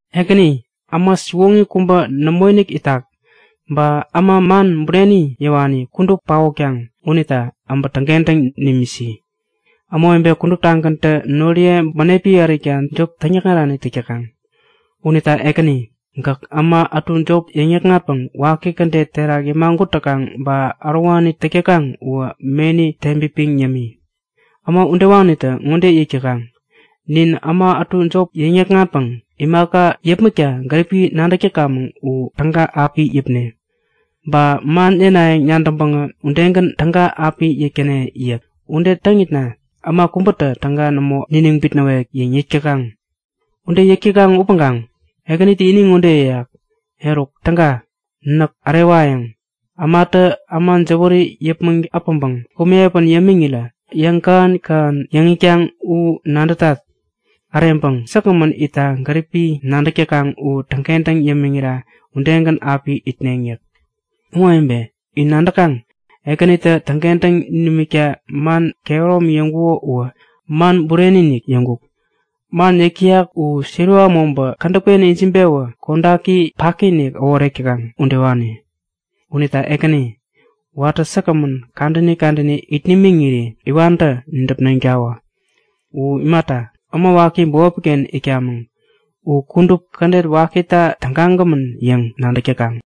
Ekäni, äma siwoŋi kubä nämoinik itak. Ba äma man bureni yäwani kudup paotkaŋ unita äbä täŋkentäŋ nimisi! Ämawebe kuduptagäntä noriye bänepi ärikta jop täŋyäkŋarani täk täkaŋ. Unita Ekäni, gäk äma ätu jop yäŋ-yäkŋatpäŋ waki kädet terak yämagut täkaŋ ba ärowani täk täkaŋ uwä meni teŋpipiŋ yämi! Äma udewanitä ŋode yäk täkaŋ; Nin äma ätu jop yäŋ-yäkŋatpäŋ imaka yäpmäkta gäripi nadäk täkamäŋ u täga api yäpne. Ba man yänayäŋ nadäŋpäŋä udegän täga api yäk täne yäk. Ude täŋitna äma kubätä täga nämo niniŋ bitnäwek yäŋ yäk täkaŋ. Ude yäk täkaŋ upäŋkaŋ Ekänitä ini ŋode yäyak; Eruk täga! Näk ärewayäŋ! Ämatä äma jäwäri yäpmäŋ äpäŋpäŋ komi piä yämiŋirä yäŋkähän-kähän yäŋ itkaŋ u nadätat. Äreŋpäŋ säkgämän itta gäripi nadäk täkaŋ u täŋkentäŋ yämiŋira udegän api itneŋ yäk. Ämawebe, in nadäkaŋ? Ekänitä täŋkentäŋ nimikta man kehäromi yäŋkuko uwä man bureni-inik yäŋkuk. Man yäk täyak u siliwa mobä kädäpken ijiŋpewä kodaki paki-inik äworek täkaŋ udewani. Unita Ekäni, watä säkgämän kadäni kadäni it nimiŋiri iwantä nidäpneŋtawä. U imata, äma waki bämopiken itkamäŋ. U kudup kädet wakita tägagämän yäŋ nadäk täkaŋ.